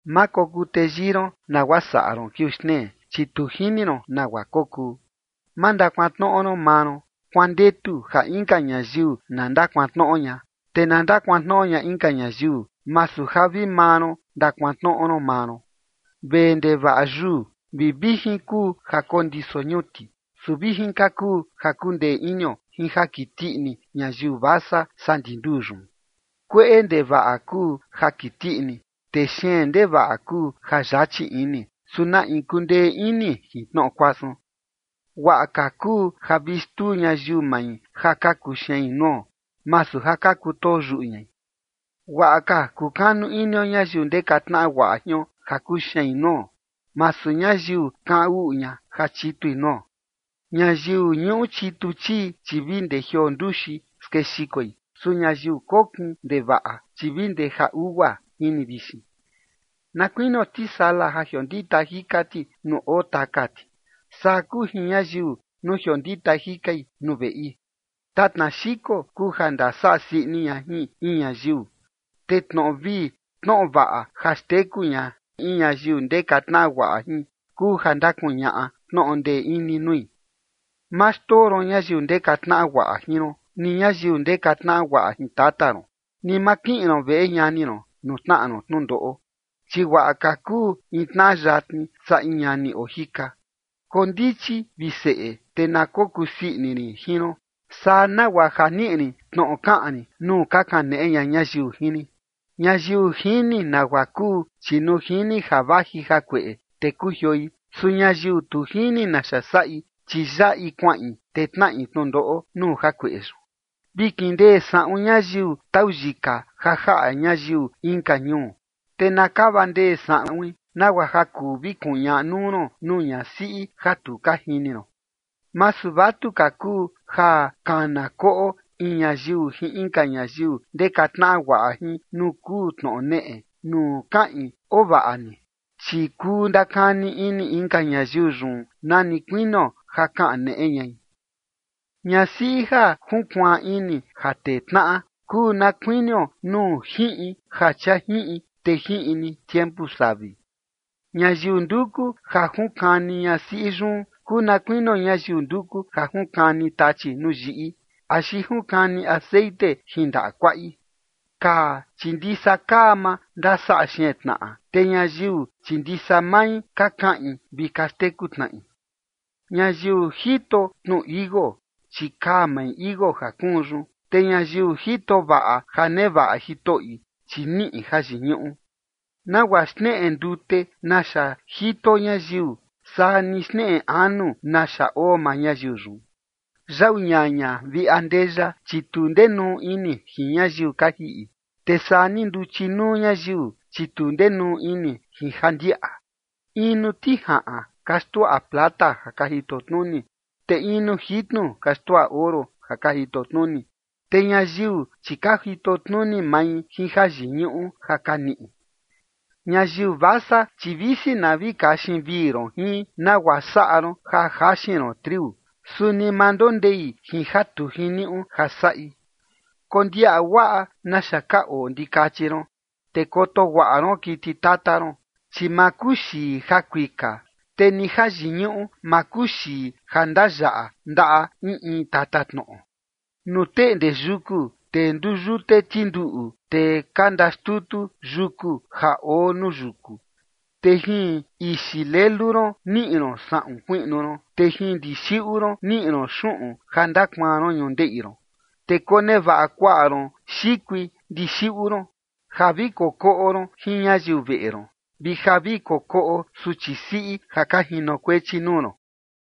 Ma kokuu teyii ron nagua saꞌa ron kiuu xtnee, chi tu jini ron nagua kokuu. Ma ndakuantnoꞌo ron maa ron, kuandetu ja inka ñayiu na ndakuantnoꞌo ña. Te na ndakuantnoꞌo ña inka ñayiu, masu ja vi maa ron ndakuantnoꞌo ron maa ron. Vee ndevaꞌa yuu vi vijin kuu ja kondiso ñuti. Su vijin ka kuu ja kundee inio jin ja kiti ini ñayiu vasa, saa ndi nduu yun. Kueꞌe ndevaꞌa kuu ja kiti ini, te xeen ndevaꞌa kuu ja yachi ini, ¿su na in kundee ini jin tnoꞌo kuasun? Guaꞌa ka kuu ja vi xtuu ñayiu mai ja ka kuxein nuo, masu ja ka kutoo yuꞌu ñai. Guaꞌa ka kukanu inio ñayiu ndeka tnaꞌa guaꞌa jion ja kuxein nuo, masu ñayiu kaꞌan uꞌu ña ja chitui nuo. Ñayiu ñuꞌu chitu chii, chi vi ndee jioo nduxi skexikoi. Su ñayiu kokin ndevaꞌa, chi vi ndee ja ugua jini vixin. Na kuinio tisala ja jiondita jika ti nuu oo taka ti, saa kuu jin ñayiu nuu jiondita jikai nuu veꞌi. Tatna xiko kuu ja ndasaꞌa sii ini ña jin in ñayiu, te tnoꞌo vii tnoꞌo vaꞌa ja xteku ña in ñayiu ndeka tnaꞌa guaꞌa jin, kuu ja ndakuñaꞌa tnoꞌo ndee ini nui. Ma xndoo ron ñayiu ndeka tnaꞌa guaꞌa jin ron, ni ñayiu ndeka tnaꞌa guaꞌa jin tata ron. Ni ma kiꞌin ron veꞌe ñani ron nuu tnaꞌa ron tnundoꞌo, chi guaꞌa ka kuu in tnaꞌa yatni saa in ñani oo jika. Kondichi, vi seꞌe, te na kokuu sii ini rin jin ron, saa nagua ja niꞌi rin tnoꞌo kaꞌan rin nuu ka kaneꞌe ña ñayiu jin rin. Ñayiu jini nagua kuu, chi nuu jini ja vaji jakueꞌe, te kujioi. Su ñayiu tu jini naxa saꞌi, chi yaꞌi kuaꞌin, te tnaꞌi tnundoꞌo nuu jakueꞌe yun. Vi kindee saꞌun ñayiu tau yika ja jaꞌa ñayiu inka ñuu, te na kava ndee saꞌuin nagua ja kuu vi kuñaꞌa nuu ron nuu ñasiꞌi ja tu ka jini ron. Masu vatuka kuu ja kana koꞌo in ñayiu jin inka ñayiu ndeka tnaꞌa guaꞌa jin nuu kuu tnoꞌo neꞌe, nuu kaꞌin “oo vaꞌa ni”, chi kuu ndakani ini inka ñayiu yun nani kuinio ja kaneꞌe ñai. Ñasiꞌi ja junkuaan ini ja tee tnaꞌa kuu na kuinio nuu jiꞌin ja chia jiꞌin te jiꞌin ni tiempu savi. Ñayiu nduku ja junkani ñasiꞌi yun kuu na kuinio ñayiu nduku ja junkani tachi nuu yiꞌi, axi junkani texeꞌen jin ndaꞌa kuaꞌi. Kaa, chi ndisa kaa maa ndasaꞌa xeen tnaꞌa, te ñayiu, chi ndisa mai ka kaꞌin vi ka xteku tnaꞌi. Ñayiu jito tnu tichi iuu, chi kaa mai tichi iuu ja kuun yun, te ñayiu jito vaꞌa ja nevaꞌa jitoꞌi, chi niꞌi jayiñuꞌu. Nagua xneꞌe ndute naxa jito ñayiu, saa ni xneꞌe anu naxa oo maa ñayiu yun. Yau ñaña vi andeya, chi tu ndenuu ini jin ñayiu ka jiꞌi, te saa ni nduchi nuu ñayiu, chi tu ndenuu ini jin ja ndiaꞌa. In nuu tijaꞌan ka xnduaꞌa plata ja ka jito tnuni, te in nuu jitnu ka xnduaꞌa oro ja ka jito tnuni, te ñayiu, chi ka jito tnuni mai jin jayiñuꞌu ja ka niꞌi. Ñayiu vasa, chi visi na vi kaxin vii ron jin, nagua saꞌa ron ja jaxin ron triu, suni ma ndondei jin ja tu jiniuꞌu ja saꞌi. Kondiaꞌa guaꞌa naxa ka oo ndikachi ron, te koto guaꞌa ron kiti tata ron, chi ma kuxii ja kuika, te ni jayiñuꞌu ma kuxii ja ndayaꞌa ndaꞌa in in tatatnoꞌo. Nuu teꞌnde yuku, te nduyute tinduꞌu, te ka ndaxtutu yuku ja oo nuu yuku. Te jin ixi lelu ron, niꞌi ron saꞌun kuiꞌnu ron, te jin ndixiꞌu ron, niꞌi ron xuꞌun ja ndakuaan ron ñundeꞌi ron. Te konevaꞌa kuaꞌa ron xikui ndixiꞌu ron ja vi kokoꞌo ron jin ñayiu veꞌe ron, vi ja vi kokoꞌo suchi siꞌi ja ka jinokuechi nuu ron.